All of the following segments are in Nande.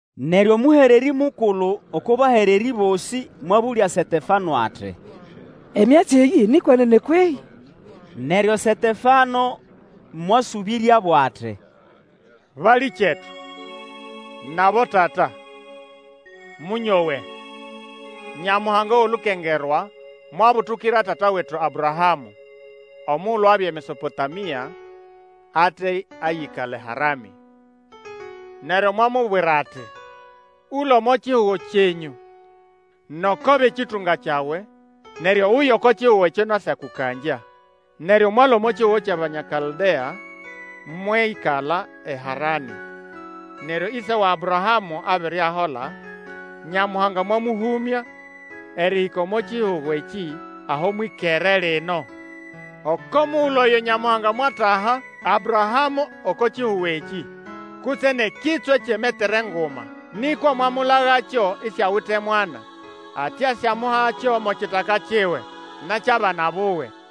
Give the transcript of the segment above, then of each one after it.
Neryo omũhererĩ mukulu oko bahererĩ bosĩ mwabũlya Setefano ati, Emyatsi eyĩ ni kwenene kwehĩ? Neryo Setefano mwasũbĩryabo ati, Balĩkyetu, nʼabotata, mũnyowe! Nyamuhanga wʼolukengerwa mwabutukira tata wetu Abrahamũ, omugulu abya eMesopotamia, ate ayĩkala eHaranĩ. Neryo mwamubwira ati, Ũlũe omo kihugo kyenyũ, noko bʼekĩtũnga kyawe, neryo uye oko kihugo ekyo nasyakũkangya. Neryo mwalũa omo kihugo kyʼAbanya Kaldea, mwĩkala eHaranĩ. Neryo ĩse wa Abrahamũ abere ahola, Nyamuhanga mwamũhũmya erĩhĩka omo kihugo ekĩ aho mwĩkere lino. Oko mugulu oyo Nyamuhanga mwataha Abrahamũ oko kihugo ekĩ, kutse nʼekitswe kyʼemetere nguma. Nĩkwa mwamulagakyo isiawite mwana, ati asyamuhakyo mo kitaka kiwe, nʼekyʼabana buwe.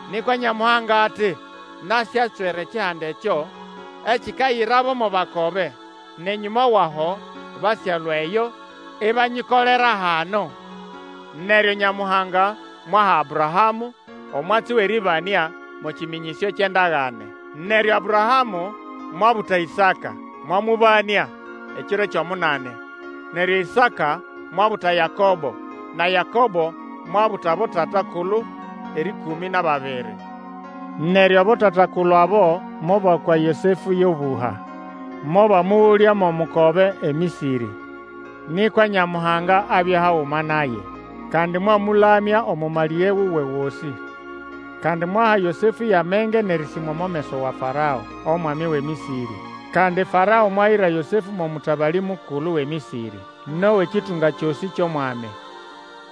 Nĩkwa Nyamuhanga ati, Nasyatswera ekihanda ekyo ekikayirabo mo bakobe, nʼenyũma wʼaho basyalũa eyo, ibanyikolera hano. Neryo Nyamuhanga mwaha Abrahamũ, omwatsi wʼerĩbanĩa mo kĩmĩnyĩsyo kyʼendagane. Neryo Abrahamũ mwabuta Ĩsaka, mwamũbanĩa ekiro kyʼomunani; neryo Ĩsaka mwabuta Yakobo, na Yakobo mwabuta abotatakulu erĩkũmĩ nʼababiri. Neryo abotata-kulu abo mobakwa Yosefũ yʼobũha, mobamũgũlya mo mukobe eMĩsĩrĩ. Nĩkwa Nyamuhanga abya haguma naye. Kandi mwamũlamya omo malĩge wuwe gosĩ. Kandi mwaha Yosefũ yʼamenge nʼerĩsĩmwa omo meso wa Farao, omwami wʼeMĩsĩrĩ. Kandi Farao mwayira Yosefũ mo mũtabalĩ mukulu wʼeMĩsĩrĩ, nʼowʼekĩtũnga kyosĩ kyʼOmwami.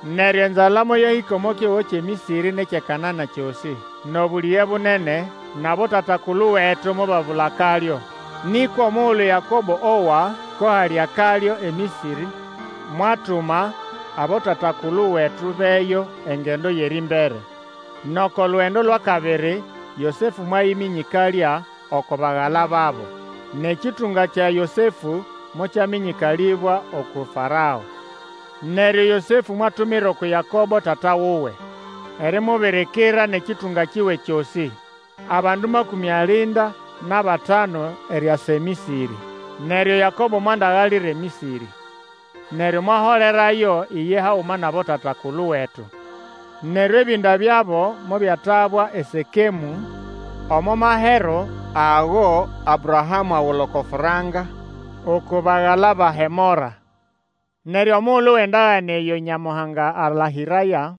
Neryo enzala moyahĩka omo kihugo kyʼeMĩsĩrĩ nʼekyʼeKanana kyosĩ, nʼobũlĩge bunene, nʼabotata-kulu wetu mobabula akalyo. Nĩkwa omugulu Yakobo owa ko hali akalyo eMĩsĩrĩ, mwatuma, abotata-kulu wetu bʼeyo engendo yʼerĩmbere. Nʼoko lugendo lwʼakabiri Yosefũ mwayĩmĩnyĩkalya oko bagala babo, nʼekĩtũnga kya Yosefũ mokyamĩnyĩkalĩbwa uku Farao. Neryo Yosefũ mwatumira uku Yakobo tata wuwe erimubirikira nʼekĩtũnga kiwe kyosĩ, abandu makũmĩ alinda nʼabatanu eriasa eMĩsĩrĩ. Neryo Yakobo mwandagalira eMĩsĩrĩ, neryo mwaholerayo iye haguma nʼabotata-kulu wetu, Neryo ebĩnda byabo mobyatabwa eSekemũ omo mahero ago Abrahamũ agula oko franka uku bagala ba Hemora. Neryo omugulu wʼendagane eyo Nyamuhanga alahĩraya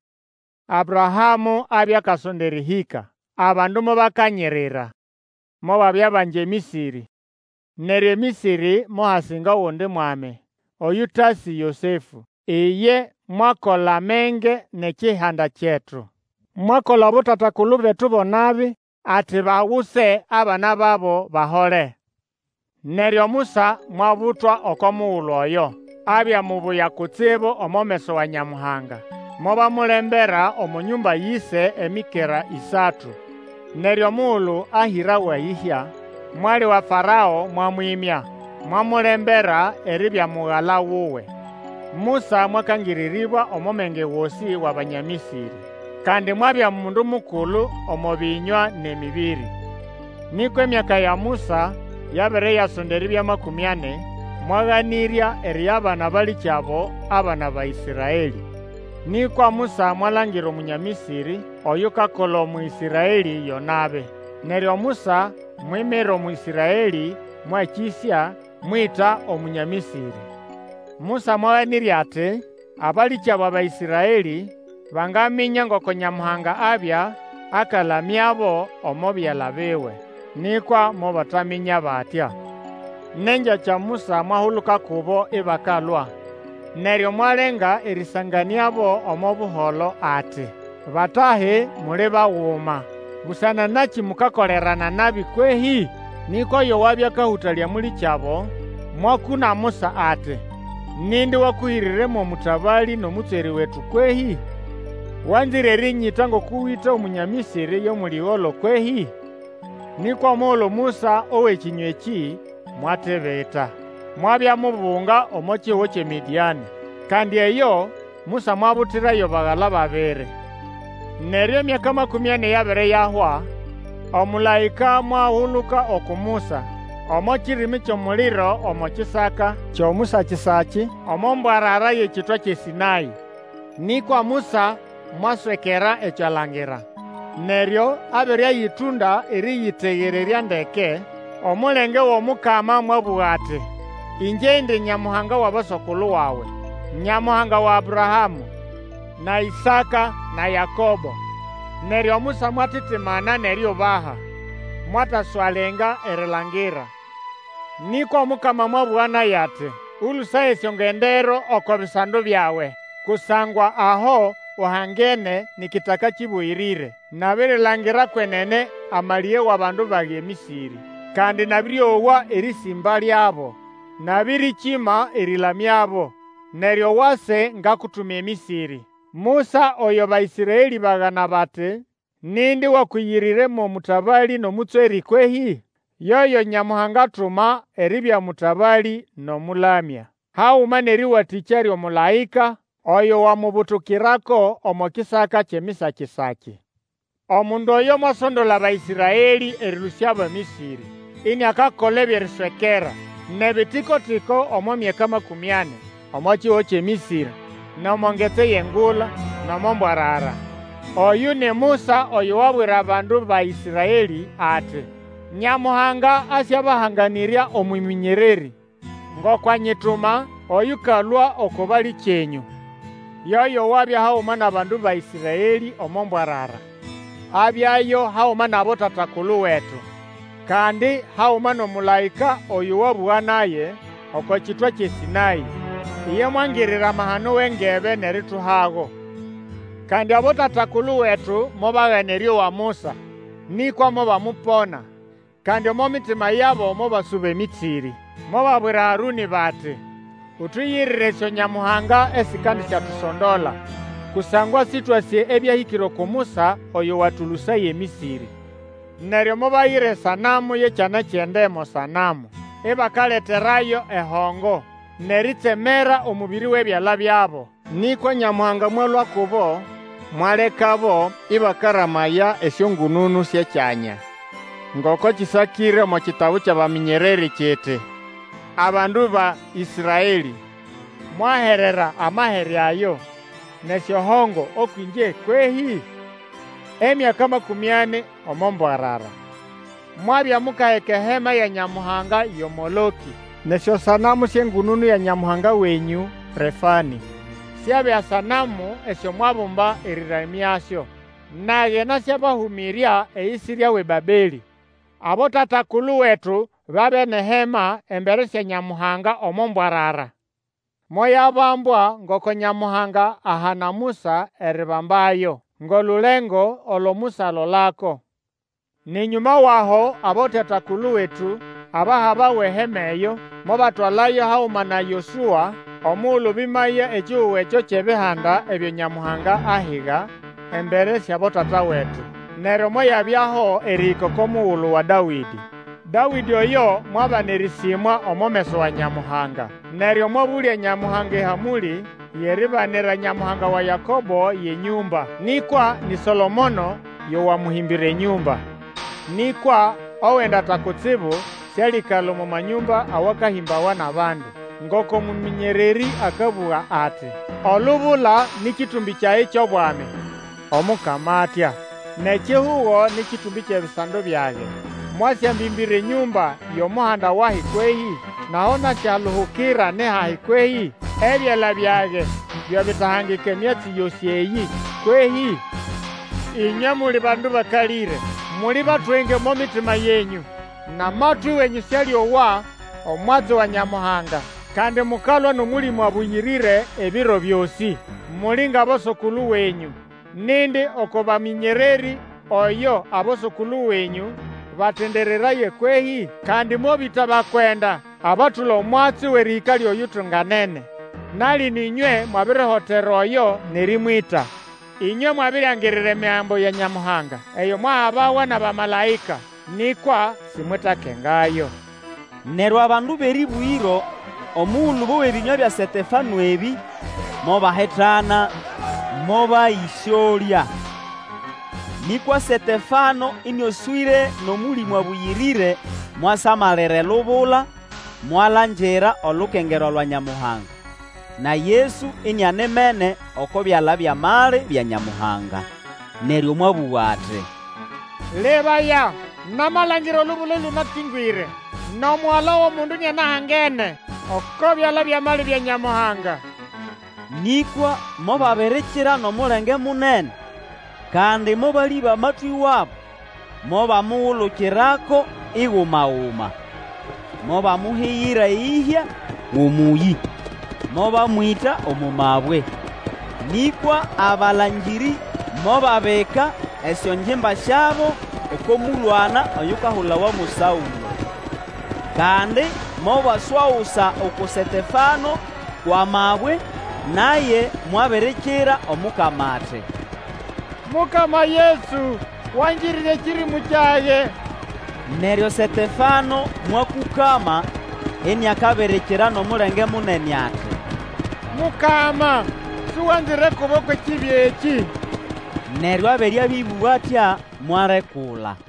Abrahamũ abya akasonda erĩhĩka, abandu mobakanyirira, mobabya bangi eMĩsĩrĩ. Neryo eMĩsĩrĩ mohasinga ogundi mwami, oyũtasĩ Yosefũ. Iye mwakola menge nʼekihanda kyetu, mwakola abotata-kulu betu bo nabi, ati baguse abana babo bahole. Neryo Musa mwabutwa oko mugulu oyo. Abya mubuya kutsibu omo meso wa Nyamuhanga, mobamulembera omo nyũmba yʼĩse emikera ĩsatu. Neryo omugulu ahĩrawa eyĩhya, mwali wa Farao mwamwĩmya, mwamulembera eribya mugala wuwe. Musa mwakangĩrĩrĩbwa omo menge gosĩ wʼAbanya Mĩsĩrĩ, kandi mwabya mundu mukulu omo bĩnywa nʼemĩbĩrĩ. Nĩkwa emyaka ya Musa yabere yasonda eribya makũmĩ ani, mwaganĩrya eriyabana abalĩkyabo abana ba Ĩsraelĩ. Nĩkwa Musa mwalangira Omunya Mĩsĩrĩ oyukakola Omũĩsraelĩ yo nabi, neryo Musa mwimira Omũĩsraelĩ mwakĩsya mwĩta Omunya Mĩsĩrĩ. Musa mwaganĩrya ati abalĩkyabo Abaĩsraelĩ banganĩmya ngoko Nyamuhanga abya akalamyabo omo byala biwe, nĩkwa mobataminya batya. Nʼengyakya Musa mwahuluka kubo ibakalwa, neryo mwalenga erĩsanganĩabo omo buholo ati, Batahi muli baguma, busana nakĩ mukakolerana nabi kwehĩ? Nĩkwa oyo wabya akahũtalya mũlĩkyabo, mwakũna Musa ati, Nindi wakũhĩrĩre mo mũtabalĩ nʼomũtswerĩ wetu kwehĩ? Wanzĩre erĩnyĩta ngoko wĩta Omunya Mĩsĩrĩ yo mũlĩgolo kwehĩ? Nĩkwa omugulu Musa owa ekĩnywa ekĩ mwatibita, mwabya mubunga omo kihugo kyʼeMĩdĩanĩ. Kandi eyo Musa mwabutirayo bagala babiri. Neryo emyaka makũmĩ ani yabere yahwa, omũlaĩka mwahuluka uku Musa omo kirimi kyʼomuliro omo kisaka kyʼomusakisaki omo mbwarara yʼekitwa kyʼeSĩnaĩ. Nĩkwa Musa mwaswekera ekyo alangira, neryo abere ayĩtũnda erĩyĩtegererya ndeke, omulenge wʼOmukama mwabũga ati, Ĩngye indi Nyamuhanga wʼaboso-kulu wawe, Nyamuhanga wa Abrahamũ, na Ĩsaka, na Yakobo. Neryo Musa mwatitimana nʼeriubaha, mwataswalenga erilangira. Nĩkwa Omukama mwabũga naye ati, Ũlũsaye esyongendero oko bisando byawe, kusangwa aho uhangene ni kitaka kĩbũyĩrĩre. Nabirilangira kwenene amalĩge wʼabandu bage eMĩsĩrĩ. Kandi nabĩrĩowa erĩsĩmba lyabo, nabĩrĩkĩma erĩlamyabo. Neryo wase ngakutuma eMĩsĩrĩ. Musa oyo Baĩsraelĩ bagana bati, Nindi wakũyĩrĩre mo mũtabalĩ nʼomũtswerĩ kwehĩ? Yoyo Nyamuhanga atuma eribya mũtabalĩ nʼomũlamya, haguma nʼerĩwatĩkya lyʼomũlaĩka oyo wamubutukirako omo kisaka kyʼemisakisaki. Omundu oyo mwasondola Abaĩsraelĩ erĩlũsyabo eMĩsĩrĩ, iniakakola ebyʼeriswekera, nʼebitiko-tiko omo myaka makũmĩ ani, omo kihugo kyʼeMĩsĩrĩ, nʼomo Ngetsi yʼeNgula, nʼomo mbwarara. Oyũ ni Musa oyo wabwira bandu ba Ĩsraelĩ ati, Nyamuhanga asyabahanganĩrya omũmĩnyererĩ, ngoko anyituma, oyũkalũa oko balĩkyenũ. Yoyo wabya haguma nʼabandu ba Ĩsraelĩ omo mbwarara. Abyayo haguma nʼabotata-kulu Wetu, kandi haguma nʼomũlaĩka oyo wabũga naye oko kitwa kyʼeSĩnaĩ. Iye mwangirira amahano wʼengebe nʼerituhago. Kandi abotata-kulu wetu mobagana erĩowa Musa, nĩkwa mobamupona, kandi omo mitima yabo mobasuba eMĩsĩrĩ. Mobabwira Harũnĩ bati Utuyirire esyonyamuhanga esikandisyatusondola. Kusangwa Sĩtwasĩ ebyahĩkĩre uku Musa oyo watũlũsaya eMĩsĩrĩ. Neryo mobayira esanamu yʼekyana kyʼende mo sanamu, ibakaleterayo ehongo, nʼeritsemera omũbĩrĩ wʼebyala byabo. Nĩkwa Nyamuhanga mwalũa kubo, mwalekabo ĩbakaramaya esyongũnũnũ syʼekyanya; ngoko kĩsakĩre omo kitabu kyʼabamĩnyererĩ kiti, Abandu ba Ĩsraelĩ! Mwaherera amahere ayo nʼesyohongo ũkwʼĩngye, kwehĩ? Emyaka makũmĩ ani omo mbwarara. Mwabya mukaheka ehema ya nyamuhanga yo Molokĩ. Nʼesyosanamu syʼengũnũnũ ya nyamuhanga wenyũ Refanĩ; Syabya sanamu esyo mwabumba erĩramyasyo. Nage nasyabahũmĩrya eyisirya wʼeBabelĩ. Abotata-kulu wetu babya nʼehema embere sya Nyamuhanga omo mbwarara. Moyabambwa ngoko Nyamuhanga ahana Musa eribambayo, ngʼolulengo olo Musa alolako. Nʼenyũma wʼaho abotata-kulu wetu, abahabawa ehema eyo, mobatwalayo haguma na Yosũa omugulu bĩmaya ekihugo ekyo kyʼebihanda ebyo Nyamuhanga ahiga embere syʼabotata wetu. Neryo moyabyaho erĩhĩka oko mugulu wa Dawĩdĩ. Dawĩdĩ oyo mwabana erĩsĩmwa omo meso wa Nyamuhanga, neryo mwabũlya Nyamuhanga ehamũlĩ yʼeribanira Nyamuhanga wa Yakobo yʼenyũmba. Nĩkwa ni Solomono yo wamũhĩmbĩra enyũmba. Nĩkwa, Owendata Kutsibu sĩalĩkala omo manyũmba awakahĩmbawa nʼabandu, ngoko mũmĩnyererĩ akabũga ati, Olubula nĩ kĩtũmbĩ kyage kyʼobwami, Omukama atya; Nʼekihugo nĩ kĩtũmbĩ kyʼebisando byage. Mwasyambĩmbĩra enyũmba yʼomuhanda wahi kwehĩ? Nʼaho nasyaluhukira ni hahi kwehĩ? Ebyala byage byo bitahangika emyatsi yosĩ eyĩ kwehĩ? Ĩnywe muli bandu bakalĩre! Muli batwenge omo mitima yenyũ, nʼamatwĩ wenyũ sĩalĩowa omwatsi wa Nyamuhanga. Kandi mukalwa nʼOmũlĩmũ Abũyĩrĩre ebiro byosĩ. Muli ngʼaboso-kulu wenyũ. Nindi oko bamĩnyererĩ oyo aboso-kulu wenyũ batendereraya kwehĩ? Kandi mobĩta abakwenda abatũla omwatsi wʼerĩhĩka lyʼOyutunganene. Na lino ĩnywe mwabirihotera oyo nʼerĩmwĩta. Inywe mwabiriangirira Emigambo ya Nyamuhanga eyo mwahabawa nʼabamalaĩka, nĩkwa simwetakengayo. Neryo abandu bʼerĩbũgĩro, omugulu bowa ebĩnywa bya Setefano ebĩ, mobahitana mobayĩsyolya. Nĩkwa Setefano ĩnĩoswĩre nʼOmũlĩmũ Abũyĩrĩre mwasamalira elubula mwalangira olukengerwa lwa Nyamuhanga, na Yesu inianimene oko byala byʼamali bya Nyamuhanga. Neryo mwabũga ati, Lebaya! namalangira olubula ĩlũnakĩngwĩre, nʼomugala wʼOmundu iniahangene oko byala byʼamali bya Nyamuhanga! Nĩkwa mobabirikira nʼomulenge munene, kandi mobalĩba amatwĩ wabo, mobamugulukirako, iguma-guma. Mobamuhigira eyĩhya wʼomũyĩ, mobamwĩta omo mabwe. Nĩkwa abalangĩrĩ mobabika esyongimba syabo oko mũlwana oyukahulawa mo Saũlo. Kandi mobaswagusa uku Setefano kwʼamabwe, naye mwabirikira Omukama ati, Mukama Yesu, wangirire ekĩrĩmũ kyage! Neryo Setefano mwakũkama, iniakabirikira nʼomulenge munene ati, Mukama, Suganzire kubo kwʼekibi ekĩ! Neryo abere abĩbũga atya, mwalekula.